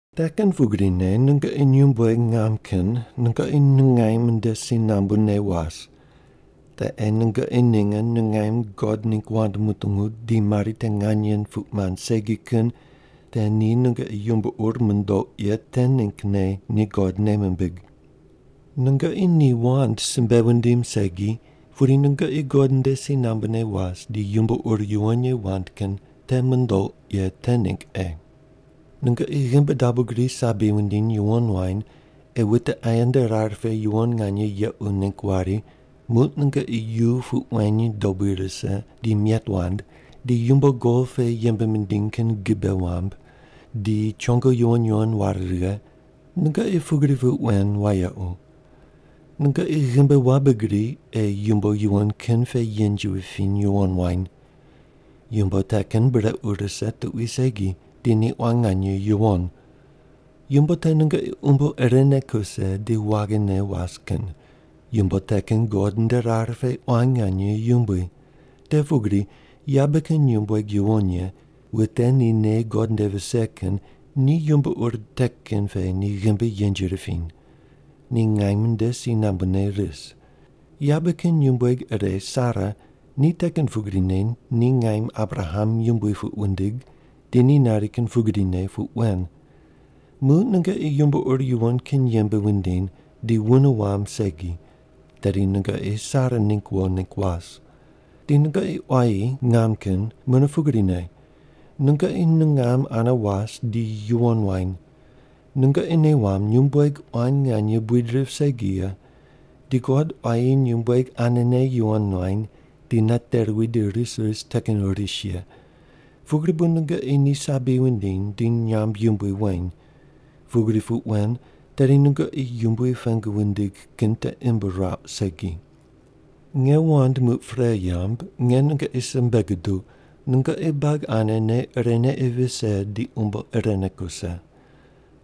Te kin pugrine nungoqi nyumbueg ngam kin nungoqi nungaim nde si nambune was. Te ei nungoqi ninge nungaim God ningg wand mutungu di mari te nganye puq mand segi kin te ni nungoqi yumbo ur mundouq ye te ninggne ni God nei mimbig. Nungoqi ni wand simbe wundim segi, pudi nungoqi God nde si nambune was di yumbo ur yuwon ye wand kin te mundouq ye te ningg ei. Nungoqi ghimbi dabo gri sabi wundiny yuwon wany ei wute aye nde rar pe yuwon nganye yequ ningg wari muq nungoqi yu puq weny dobui rise di miet wand, di yumbo gol pe yembe mindiny kin gibe wamb, di chongo yuwon yuwon ware righe; nungoqi pugri puq wen wayequ. Nungoqi ghimbi wabe gri ei yumbo yuwon kin pe yenji wupiny yuwon wany. Yumbo te kin brequ rise tuqui segi di ni quan nganye yuwon. Yumbo te nungoqi umbo irene kuse di waghine was kin. Yumbo te kin God nde rar pe quan nganye yumbui. Te pugri yabe kin nyumbueg yuwon ye, wute ni nei God nde vise kin ni yumbo ur te kin pe ni ghimbi yenji ripiny. Ni ngaim nde si nambune ris. Yabe kin nyumbueg ire Sara, ni te kin pugrine ni ngaim Abraham yumbui puq wundig, di ni nari kin pugrine puq wen. Muq nungoqi yumbo ur yuwon kin yembe wundiny di wune wamb segi, tedi nungoqi Sara ningg wo ningg was. Di nungoqi quayi ngam kin mune pugrine, nungoqi nungam ane was di yuwon wany. Nungoqi nei wamb nyumbueg quan nganye buid rip segi ye, di God quayi nyumbueg anene yuwon nuany di nate ruwi di ris ris te kin ris ye, pugri bu nungoqi ni sabi wundiny di nyamb yumbui weny. Pugri puq wen tedi nungoqi Yumbui pengu wundig kin te imb ruauq segi. Nge wand muq pre yamb, nge nungoqi simbe guduq, nungoqi buagi ane nei irene ei vise di umbo irene kuse.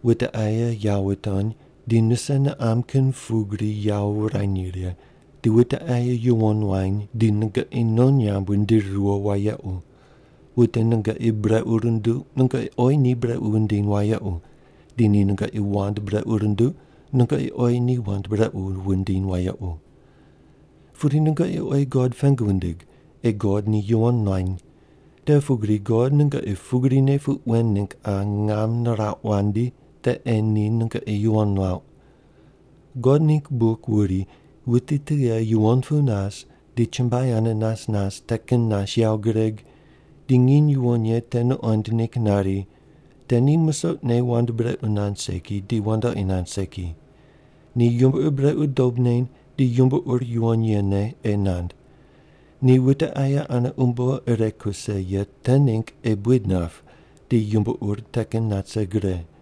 Wute aye yawo wutony, di nuse niqam kin pugrine yawo wurany righe, di wute aye yuwon wany di nungoqi non nyamb wundiri riyo wayequ. Wute nungoqi brequ runduq nungoqi oyi ni brequ wundiny wayequ, di ni nungoqi wand brequ runduq nungoqi oyi ni wand brequ wundiny wayequ. Pudi nungoqi oyi God pengu wundig ei God ni yuwon nuany. Te pugri God nungoqi pugrine puq wen ningg qa ngam nirauq wandi te ei ni nungoqi yuwon nuauq. God ningg buk wuri, “Wuti tughe yuwon pu nas di chumbuai ane nas nas te kin nas yawo gureg, di nginy yuwon ye te nuqond ningg nari, te ni musoqne wand brequ nand segi di wandoqi nand segi. Ni yumbo ur brequ dob neny di yumbo ur yuwon yene ei nand. Ni wute aye ane umbo ire kuse ye te ningg ei buid nap di yumbo ur te kin nat rise gre.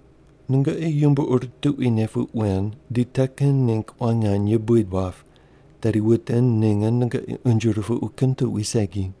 Nungoqi yumbo ur tuquine puq wen di te kin ningg quan nganye buid wap, tedi wute ninge nungoqi unje rupuqu kin tuqui segi.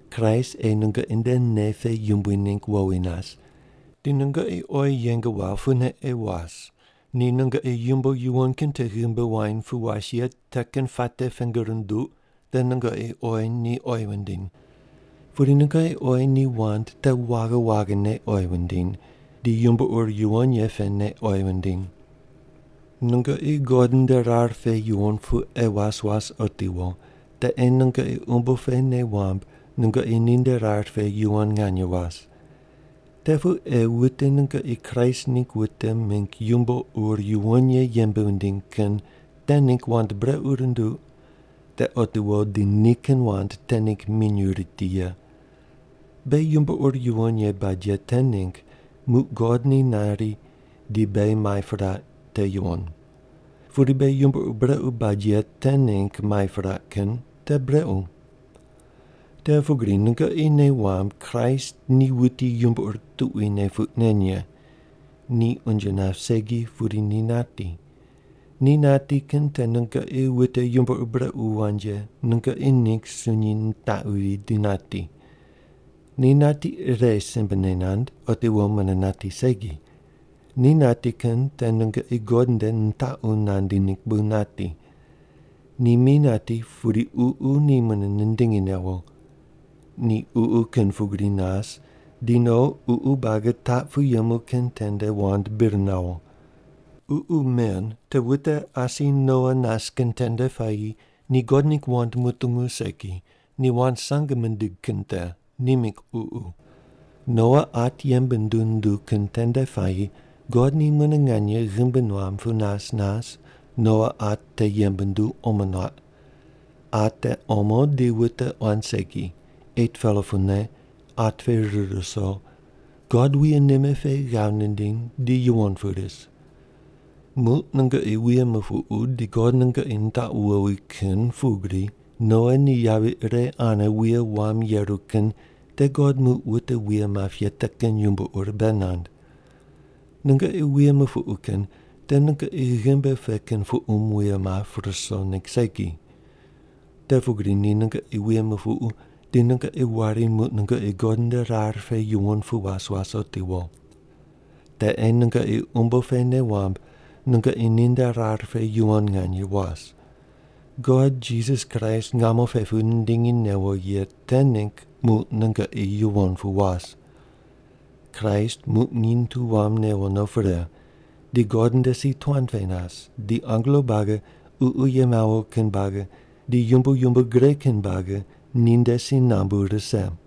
Kraist ei nungoqi nde nei pe yumbui ningg wowi nas. Di nungoqi oyi yeng wawo pune ei was, ni nungoqi yumbo yuwon kin te ghimbi wuany pu was ye te kin puate pengu runduq te nungoqi oyi ni oyi wundiny. Pudi nungoqi oyi ni wand te waghi waghine oyi wundiny di yumbo ur yuwon ye pene oyi wundiny. Nungoqi God nde rar pe yuwon pu ei was was otiwo, te ei nungoqi umbo pe nei wamb nungoqi ninde rar pe yuwon nganye was. Te pu ei wute nungoqi Kraist ningg wute mingg yumbo ur yuwon ye yembe wundiny kin te ningg wand brequ runduq, te otiwo di nikin wand te ningg minyuw riti ye. Beghi yumbo ur yuwon ye bad ye te ningg muq God ni nari di beghi mai piraq, te yuwon. Pudi beghi yumbo ur brequ bad ye te ningg mai piraq kin, te brequ. Te pugri nungoqi nei wamb Kraist ni wuti yumbo ur tuquine puq nen ye. Ni unje nap segi pudi ni nati. Ni nati kin te nungoqi wute yumbo ur brequ wand ye nungoqi ningg sunyi nitaquvi di nati. Ni nati ire simbene nand, otiwo mune nati segi. Ni nati kin te nungoqi God nde nitaqu nandi ningg bu nati. Ni mi nati, pudi Ququ ni mune nindingi newo. Ni ququ kin pugri nas di no ququ buagi taq pu yemu kin tende wand bir nawo. Ququ men te wute asi Noa nas kin tende puayi ni God ningg wand mutungu segi, ni wand sange mindig kin te, ni mingg ququ. Noa at yembe nunduw nunduw kin tende puayi God ni mune nganye ghimbi nuam pu nas nas Noa at te yembe nunduw omo nuaq. At te omo di wute quan segi, 8-pela pune, at pe rir ruso, God wuye nime pe ghav nindiny di yuwon pu ris. Muq nungoqi wuye mupuqu di God nungoqi nitaqu wowi kin pugri Noa ni yavi ire ane wuye wam yeru kin te God muq wute wuye map ye te kin yumbo ur bei nand. Nungoqi wuye mupuqu kin te nungoqi ghimbi pe kin puqum wuye map ruso ningg segi. Te pugri ni nungoqi wuye mupuqu di nungoqi wari muq nungoqi God nde rar pe yuwon pu was was otiwo. Te ei nungoqi umbo pe nei wamb nungoqi ninde rar pe yuwon nganye was. God Jisas Kraist ngamo pe pu nindingi newo ye te ningg muq nungoqi yuwon pu was. Kraist muq nginy tu wam newo no pre, di God nde si tuan pe nas di angelo buagi, ququ ye mawo kin buagi, di yumbo yumbo gre kin buagi ninde si nambu rise.